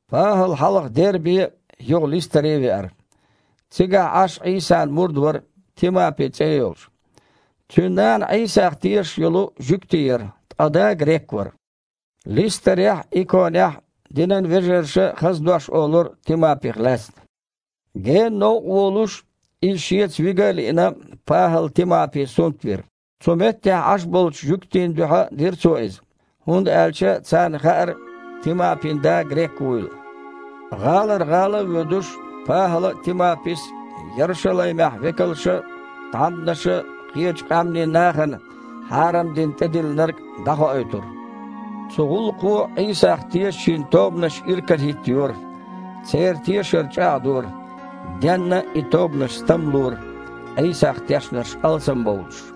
ПахІал хьалха Дербе а, юха Листаре а веара. Цигахь Іаш Іийсан мурд вара, Тимапи цІе а йолуш. Цуьнан нана Іийсах тешаш йолу жуьгти яра, ткъа да грек вара. Листарехь а, Иконехь а динан вежарша хаза дош олура Тимапих лаьцна. Гена новкъа волуш, иза шеца вига а лиъна, ПахІала Тимапи сунт вира. Цу меттехь Іаш болчу жуьгтийн дуьхьа дира цо иза, хІунда аьлча царна хаьара Тимапин да грек вуйла. ГІалара гІала а воьдуш, ПахІала а, Тимапис а Ярушалаймехь векалша а, тхьамданаша а кхечу къаьмнийн нахана хьарам дина тІедиллинарг дІахоуьйтура. Цу гІуллакхо Іийсах тешачийн тобанаш иракарахІиттайора, церан тешар чІагІдора, денна а и тобанаш стамлора, Іийсах тешнарш алсамбовлуш.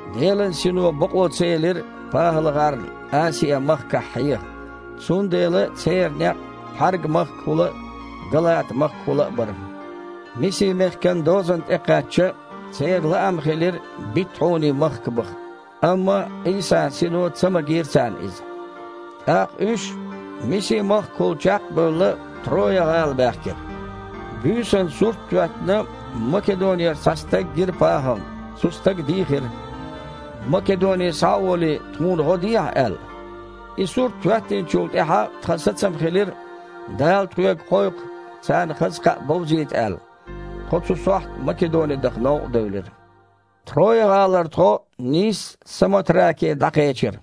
Делан Сино бакъо ца елира ПахІалгІарна Асиа-махкахь хьеха, цундела церан некъ Пхьарга-махкахула а, Галата-махкахула а бара. Миси-мехкан дозанна тІекхаьчча, церан лаам хилира Битхьуни-махка баха, амма Іийсан Сино ца магийра царна иза. ТІаккха уьш, Миси-махкахула чекх а бевлла, Троя-гІала баьхкира. Буьйсанна, сурт а хІоьттина, Македонера цхьа стаг гира ПахІална. Цу стага дийхира: «Македоне схьа а волий, тхуна гІо дехьа», – аьлла. И сурт хІоьттинчул тІаьхьа тхан сацам хилира, Дала тхоьга кхойкху, царна хаза кхаъ бовзийта аьлла. Тхо цу сохьта Македоне даха новкъа девлира. Троя-гІалара тхо нийсса Самотраке дІакхечира,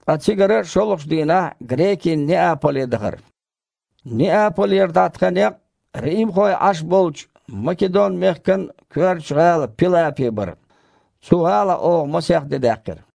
ткъа цигара шолгІачу дийнахь грекийн Неаполе дахара. Неаполера дІа тхан некъ римхой Іаш болчу Македон-мехкан коьртачу гІала Пилапе бара. Цу гІалахь оха масех де даьккхира.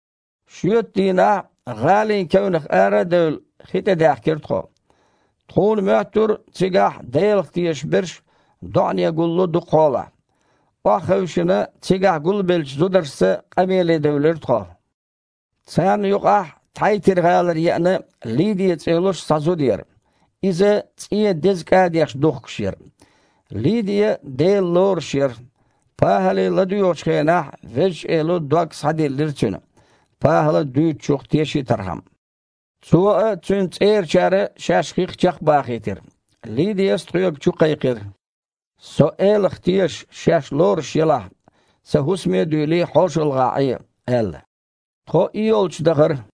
Шоьтан дийнахь, гІалин кевнах ара а девлла, хи тІе даьхкира тхо. Тхуна моьттура цигахь Делах тешаш берш доІане гулло дукха хьолахь. Охьахевшина, цигахь гулбеллачу зударшца къамеле девлира тхо. Царна юкъахь Тхьайтир-гІалара еана, Лидия цІе йолуш цхьа зуда яра. Иза цІен деза кІадеш духкуш яра. Лидия Дела лоруш яра. ПахІале ладоьгІучу хенахь Везачу Эло дог схьадиллира цуьнан, ПахІала дуьйцучух тешийтархьама. Цо а, цуьнан цІерачара а шаьш хих чекхбахийтира. Лидияс тхоьга чукхайкхира: «Со Элах тешаш шаьш лоруш елахь, сан хІусаме а дуьйлий, хьошалгІахь Іе», – аьлла. Тхо и йолчу дахара.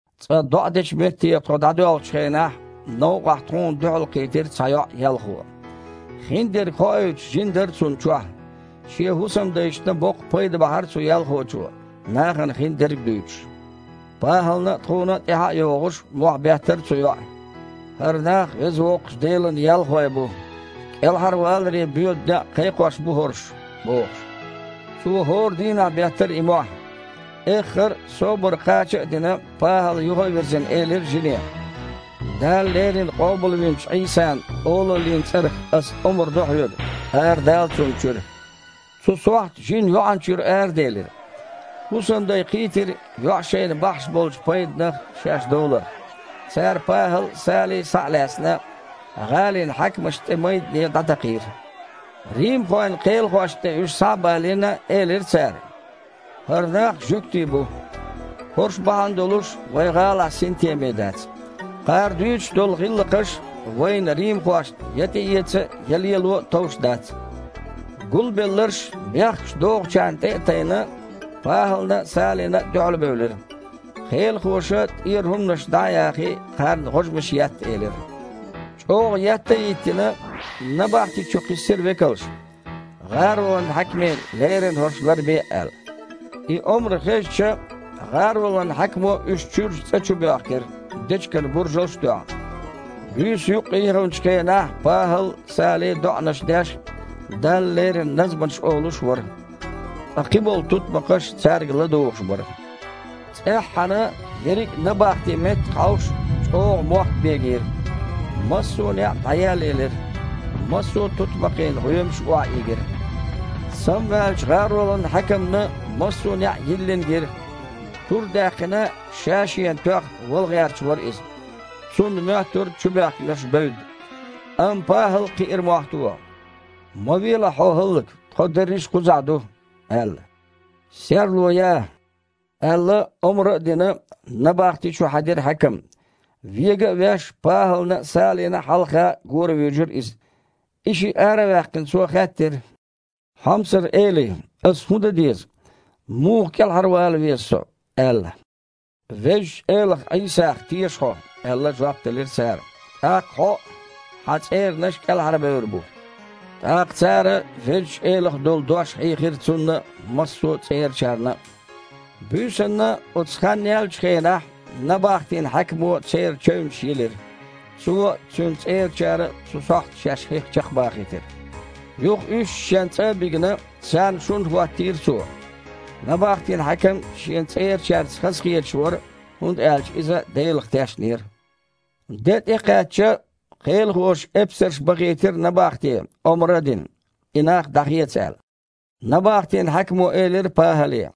Цкъа доІа дечу метте тхо дІадоьлхучу хенахь новкъахь тхуна дуьхьалкхийтира цхьа йоІ-ялхо. Хиндерг хоуьйтуш жин дара цунна чохь. Шен хІусамдайшна боккха пайда бахьара цу ялхочо, нахана хиндерг а дуьйцуш. ПахІална а, тхуна а тІаьхьа а йогІуш, мохь беттара цу йоІа: «ХІара нах Веза Воккхачу Делан ялхой бу! КІелхьарваларе боьду некъ кхайкхош бу хІорш!» – бохуш. Цо хІора дийнахь беттара и мохь. Эххар а, собар кхача а дина, ПахІала, юха а вирзина, элира жине: «Дала леррина къобалвинчу Іийсан олаллин цІарах ас омра до хьоьга: арадала цунна чуьра!» Цу сохьта жин йоІанна чуьра араделира. ХІусамдай кхийтира йоІа шайна бахьаш болчу пайданах шаьш довларх. Цара ПахІал а, Сали а, схьа а лаьцна, гІалин хьаькамашна тІе майдане дІатакхийра. Римхойн кхелахошна тІе уьш схьа а балийна, элира цара: «ХІара нах жуьгтий бу. ХІорш бахьана долуш вайн гІалахь синтеме дац. Кхара дуьйцуш долу гІиллакхаш вайна, римхошна, я тІеэца а, я лело а товш дац». Гулбелларш, бехкаш дохучарна тІе а тайна, ПахІална а, Салина а дуьхьалбевлира. Кхелахоша, тІера хІуманаш дІа а яхий, кхарна гІожмаш етта элира. ЧІогІа етта а йиттина, набахти чу кхиссира векалш, гІаролан хьаькаме леррина хІорш ларбе а аьлла. И омра хезча, гІаролан хьаькамо уьш чуьрчу цІа чу боьхкира, дечиган буржалш а тоьхна. Буьйса юккъе яханчу хенахь ПахІал а, Сали а доІанаш деш а, Далла лерина назманаш олуш а вара, ткъа кхин болу тутмакхаш цаьрга ладугІуш бара. ЦІеххьана, ерриг а набахти меттах а хьовш, чІогІа мохк бегийра. Массо а неІ дІаеллаелира, массо а тутмакхийн гІоьмаш охьаийгира. Самаваьллачу гІаролан хьаькамна массо а неІ йиллина гира. Тур а даьккхина, ша-шена тоьхна, вала гІерташ вара иза. Цунна моьттура чубоьхкинарш бевдда. Амма ПахІал кхиира мохь тоха: «Ма велахь хьо хІаллак! Тхо дерриш а кхузахь ду!» – аьлла. «Серло я!» – аьлла, омра а дина, набахти чу хьаьдира хьаькам. Вега а веш, ПахІална а, Салина а хьалха горавуьйжира иза. И шиъ ара а ваьккхина, цо хаьттира: «Хьомсара элий, ас хІун дан деза? Муха кІелхьарвала веза со?» – аьлла. «Везачу Элах Іийсах теша хьо, – аьлла, жоп делира цара, – тІаккха хьо а, хьан цІеранаш а кІелхьарбевр бу». ТІаккха цара Везачу Элах долу дош хьийхира цунна а, массо а цІерачарна а. Буьйсанна, оцу хан яьллачу хенахь, набахтин хьаькамо церан чевнаш йилира. Цо а, цуьнан цІерачара а цу сохьта шаьш хих чекхбахийтира. Юха уьш шен цІа а бигна, царна шун хІоттийра цо. Набахтин хьаькам шен цІерачаьрца хазахеташ вара, хІунда аьлча иза Делах тешнера. Де тІекхаьчча, кхелахоша эпсарш бахийтира набахте, омра а дина: «И нах дІахеца», – аьлла. Набахтин хьаькамо элира ПахІале: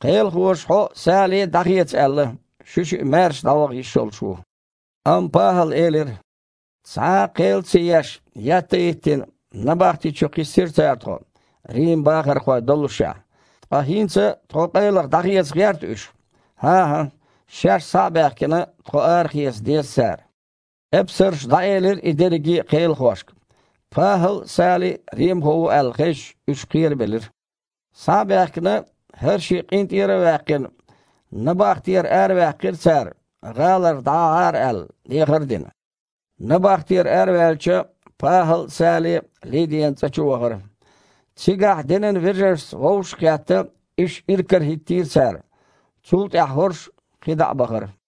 «Кхелахоша хьо а, Сали а дІахеца аьлла! Шуьшиъ маьрша дІаваха йиш йолуш ву!» Амма ПахІала элира: «Цхьа а кхел а ца еш, етта а йиттина, набахти чу кхиссира цара тхо, Риман бахархой доллушехь. Ткъа хІинца тхо къайлаха дІахеца гІерта уьш? ХІан-хІа, шаьш, схьа а баьхкина, тхо арахеца деза цара». Эпсарша дІаэлира и дерриге а кхелахошка. ПахІал а, Сали а римхо ву аьлла хезча, уьш кхерабелира. Схьа а баьхкина, хІара шиъ къинтІера а ваьккхина, набахтера араваьккхира цара, гІалара дІагІахьара аьлла, дехар а дина. Набахтера араваьлча, ПахІал а, Сали а Лидиян цІа чу вахара. Цигахь динан вежаршца вовшах а кхетта, уьш иракарахІиттийра цара. Цул тІаьхьа хІорш кхин дІа а бахара.